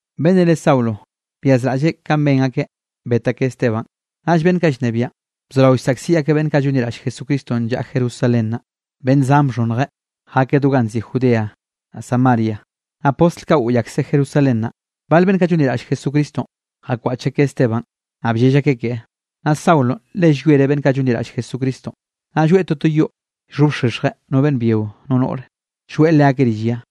Beꞌnnenꞌ re Saulo byazraꞌlleꞌ kanꞌ ben akeꞌ bet akeꞌ Esteban. Naꞌll beꞌnn kaꞌ llnebiaꞌn, bzorao llsaꞌkziꞌ akeꞌ beꞌnn kaꞌ llonliraꞌll Jesucristonꞌ llaꞌa Jerusalén naꞌ. Beꞌnn zan bxhonnje jakeꞌ do ganꞌ nziꞌi Judea, naꞌ Samaria, naꞌ postl kaꞌ goꞌy akseꞌ Jerusalén naꞌ. Bal beꞌnn kaꞌ llonliraꞌll Jesucristonꞌ, jakwaꞌch akeꞌ Esteban, naꞌ bllell akeꞌ keꞌe. Naꞌ Saulonꞌ le llwiereꞌ beꞌnn kaꞌ llonliraꞌll Jesucristonꞌ, naꞌ lloeꞌ toto yoꞌ llxhobxexjeꞌ no beꞌnn byio, no noꞌre, llgoeꞌ leakeꞌ rill ya.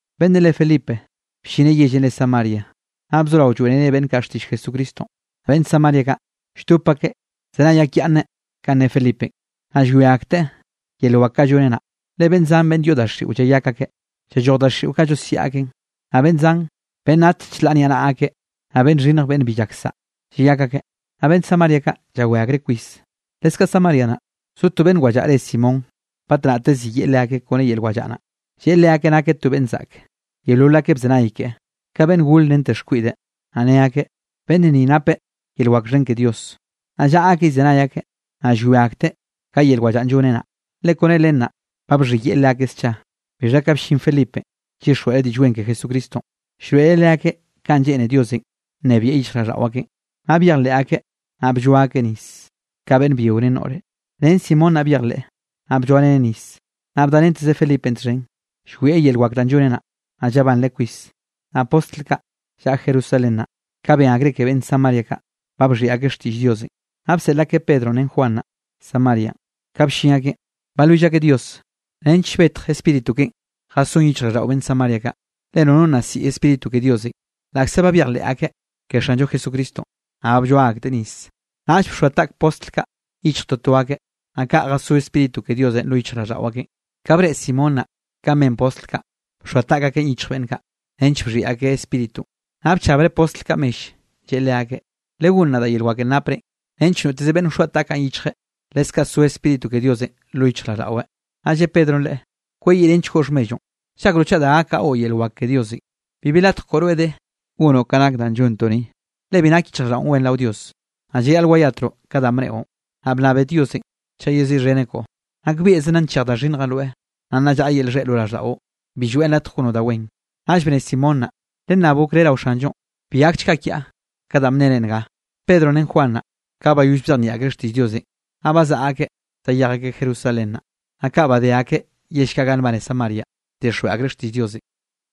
Beꞌnnenꞌ re Felipe bllineꞌ yellenꞌ re Samaria, naꞌ bzorao llroeꞌreꞌ beꞌnn kaꞌ xtiꞌll Jesucristonꞌ. Beꞌnn Samaria kaꞌ, lldop akeꞌ llzenay akyaꞌnneꞌ kanꞌ ne Felipenꞌ, naꞌ llwia akteꞌ yel wak kaꞌ lloneꞌ naꞌ. Le beꞌnn zan beꞌnn yoꞌ daxiꞌo llayak akeꞌ, llalloj daxiꞌo kaꞌ llosiaꞌ akeꞌn, naꞌ beꞌnn zan beꞌnn nat chlaꞌ niaꞌnaꞌa akeꞌ, naꞌ beꞌnn xhinnj beꞌnn bi llak saꞌa, llayak akeꞌ. Naꞌ beꞌnn Samaria kaꞌ, llawé akreꞌ kwis. Leskaꞌ Samaria naꞌ, zo to beꞌnn wallaꞌa re Simón, batnaꞌte ziyeꞌe leakeꞌ kone yel wallaꞌa naꞌ, lleꞌe leakeꞌ nakeꞌ to beꞌnn zaꞌke. Yeolol akeꞌ bzenay keꞌe, ka beꞌnn gor rente xkwiꞌde, naꞌ ne akeꞌ: —Beꞌnn ni napeꞌ yel wak xhen ke Dios. Naꞌ llaꞌa akeꞌ llzenay akeꞌ, naꞌ llwia akteꞌ ka yel wallaꞌan lloneꞌ naꞌ, le kone len naꞌ, ba bxhiyeꞌe leakeꞌ scha. Bixha ka bllin Felipenꞌ llyixjweꞌreꞌ Diꞌll Wen ke Jesucristonꞌ, llroeꞌreꞌ leakeꞌ kanꞌ lleꞌne Diosenꞌ nnebieꞌ yichjraꞌlldaꞌo akeꞌn. Naꞌ byejleꞌ akeꞌ, naꞌ blloa akeꞌ nis ka beꞌnn byio ren noꞌre. Ren Simón naꞌ byejleꞌ, naꞌ blloareneꞌ nis, naꞌ bdarenteze Felipenꞌ txhen, llwieꞌ yel wak danꞌ lloneꞌ naꞌ, naꞌ llabanreꞌ kwis. Naꞌ postl kaꞌ llaꞌa Jerusalén naꞌ, ka ben akreꞌ ke beꞌnn Samaria kaꞌ, ba bxhiꞌi akeꞌ xtiꞌll Diosenꞌ, naꞌ bseꞌl akeꞌ Pedronꞌ ren Juan naꞌ, Samarianꞌ. Ka bllin akeꞌn, balwill akeꞌ Dios nench betj Spíritu keꞌen jasón yichjraꞌlldaꞌo beꞌnn Samaria kaꞌ. Le nono nna siꞌi Spíritu ke Diosenꞌ, laꞌkze ba byejleꞌ akeꞌ ke Xanllo Jesucristonꞌ, naꞌ ba blloa akteꞌ nis. Naꞌll bxoa taꞌk postl kaꞌ yichj toto akeꞌ, naꞌ kaꞌ jasó Spíritu ke Diosenꞌ lo yichjraꞌlldaꞌo akeꞌn. Ka breꞌe Simón naꞌ kanꞌ ben postl kaꞌ, bxoa taꞌk akeꞌn yichj beꞌnn kaꞌ, nench bxhiꞌi akeꞌ Spíritunꞌ, naꞌ bchabreꞌ postl kaꞌ mell, lleꞌe leakeꞌ: —Legónn nadaꞌ yel wakenꞌ naprenꞌ, nench noteze beꞌnn wxoa taꞌkaꞌn yichjeꞌ, leskaꞌ so Spíritu ke Diosenꞌ lo yichjraꞌlldaꞌweꞌ. Naꞌ lle Pedronꞌ leꞌe: —Kweyiꞌrenchgoꞌ xhmelloꞌn, ¿llakroꞌ chaꞌ da gak gaꞌo yel wak ke Diosenꞌ? Bibi latj koꞌo rweꞌ de gonoꞌ ka nak danꞌ llontoꞌ ni, le bi nak yichjraꞌlldaꞌon wen rao Dios. Naꞌ Llayaꞌl wayatroꞌ ka danꞌ bneꞌo, naꞌ bnnabe Diosenꞌ chaꞌ yeziꞌxheneꞌ koꞌo. Nakbieꞌze nna nchej da xhinnjenꞌ rweꞌ, naꞌ nna llaꞌa yel xheꞌ lo raꞌlldaꞌo, bi lloeꞌn latj gonoꞌ da wen. Naꞌll bne Simón naꞌ: —Lennab okré rao Xanllonꞌ, bi gakchga kiaꞌ ka danꞌ bnere nga. Pedronꞌ ren Juan naꞌ, ka bayoll bzejnieꞌ akreꞌ xtiꞌll Diosenꞌ, naꞌ bazaꞌa akeꞌ zayej akeꞌ Jerusalén naꞌ. Naꞌ ka badé akeꞌ yell kaꞌ ganꞌ nbane Samarianꞌ, bdixjweꞌ akreꞌ xtiꞌll Diosenꞌ.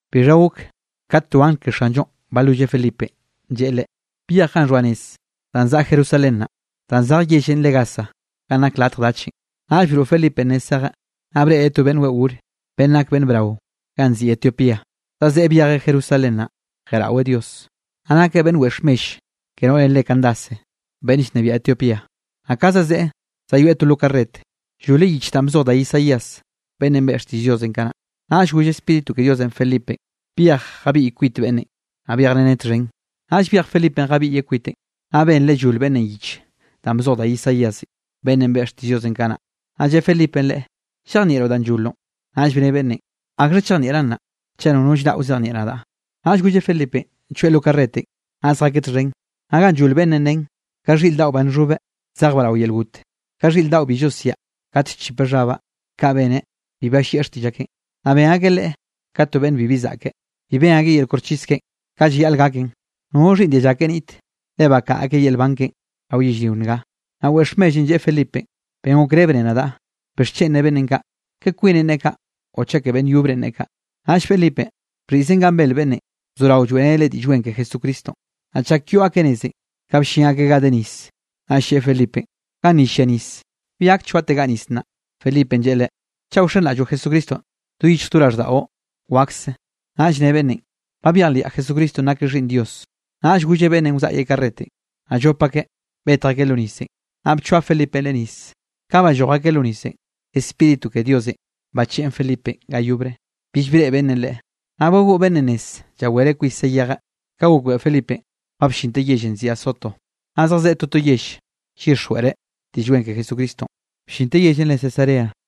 Bixha gok, kat to angl ke Xanllonꞌ balwilleꞌ Felipenꞌ, lleꞌe leꞌe: —Byej ganꞌ xhoa nez danꞌ zaꞌa Jerusalén naꞌ, danꞌ zej yellenꞌ re Gaza ganꞌ nak latj dachenꞌ. Naꞌll broꞌ Felipenꞌ nez zejeꞌ, naꞌ breꞌreꞌ to beꞌnn weꞌo gore, beꞌnn nak beꞌnn brao ganꞌ nziꞌi Etiopía, zazeꞌe byejeꞌ Jerusalén naꞌ, jeꞌraweꞌ Dios. Naꞌ nakeꞌ beꞌnn wex mell ke noꞌrenꞌ re Candace beꞌnn llnebiaꞌ Etiopía. Naꞌ ka zazeꞌe zayoeꞌ to lo karret, lloleꞌ yich danꞌ bzoj da Isaías beꞌnnenꞌ beꞌe xtiꞌll Diosenꞌ kanaꞌ. Naꞌll goll Spíritu ke Diosenꞌ Felipenꞌ: —Byej jabiꞌy kwit beꞌnnenꞌ, naꞌ byejreneꞌ txhen. Naꞌll byej Felipenꞌ jabiꞌyeꞌ kwiteꞌn, naꞌ benreꞌ llol beꞌnnenꞌ yich danꞌ bzoj da Isaíasenꞌ beꞌnnenꞌ beꞌe xtiꞌll Diosenꞌ kanaꞌ, naꞌ lle Felipenꞌ leꞌe: —¿Llejnieꞌroꞌ danꞌ lloloꞌn? Naꞌll bne beꞌnnenꞌ: —¿Akxha chejnieꞌraꞌn naꞌ, chaꞌ nono llraꞌ wzejnieꞌ nadaꞌ? Naꞌll golleꞌ Felipenꞌ choeꞌ lo karretenꞌ, naꞌ zjakeꞌ txhen. Naꞌ ganꞌ llol beꞌnnenꞌ nen: Ka xhiꞌr daꞌo ba nxhobeꞌ, zejbaꞌ rao yel got, ka xhiꞌr daꞌo bi llosiaꞌ kat llchipeꞌ xhabaꞌ, kaꞌ beneꞌ, bi ballieꞌ xtiꞌll akeꞌn. Naꞌ ben akeꞌ Leꞌe ka to beꞌnn bibi zaꞌke, bi ben akeꞌ yel koxchis keꞌen ka llayaꞌl gaken. Nono xhiꞌnn dialla keꞌe niꞌt, le bakaꞌa akeꞌ yel nban keꞌen rao yellrio nga. Naꞌ wex mellenꞌ lleꞌe Felipenꞌ: —Ben okré bne nadaꞌ, ¿bixchen ne beꞌnnenꞌ kaꞌ, ke kwineꞌn neꞌe kaꞌ o chaꞌ ke beꞌnn yobrenꞌ neꞌe kaꞌ? Naꞌll Felipenꞌ, bxhiꞌzen ganꞌ bel beꞌnnenꞌ, bzorao lloeꞌreneꞌ leꞌe Diꞌll Wen ke Jesucristonꞌ. Naꞌ chak yoꞌ akeꞌ nezenꞌ ka bllin akeꞌ ga de nis, naꞌll lleꞌe Felipenꞌ: —Ganni llia nis, ¿bi gak choategaꞌ nis nnaꞌ? Felipenꞌ lleꞌe leꞌe: —Chaꞌ wxenraꞌlloꞌ Jesucristonꞌ do yichj do raꞌlldaꞌo, wakse. Naꞌll ne beꞌnnenꞌ: —Ba byejliaꞌ Jesucristonꞌ nakeꞌ Xhiꞌnn Dios. Naꞌll golleꞌ beꞌnnenꞌ wzaꞌyeꞌ karretenꞌ, naꞌ llop akeꞌ betj akeꞌ lo nisenꞌ, naꞌ bchoa Felipenꞌ leꞌe nis. Ka balloj akeꞌ lo nisenꞌ, Spíritu ke Diosenꞌ bacheꞌen Felipenꞌ ga yobre, bill breꞌe beꞌnnenꞌ leꞌe. Naꞌ bagoꞌ beꞌnnenꞌ nez llawereꞌ kwis zayejeꞌ. Ka gokbeꞌe Felipenꞌ ba bllinteꞌ yellenꞌ nziꞌi Azoto, naꞌ zejzeꞌ toto yell llyixjweꞌreꞌ Diꞌll Wen ke Jesucristonꞌ, bllinteꞌ yellenꞌ re Cesarea.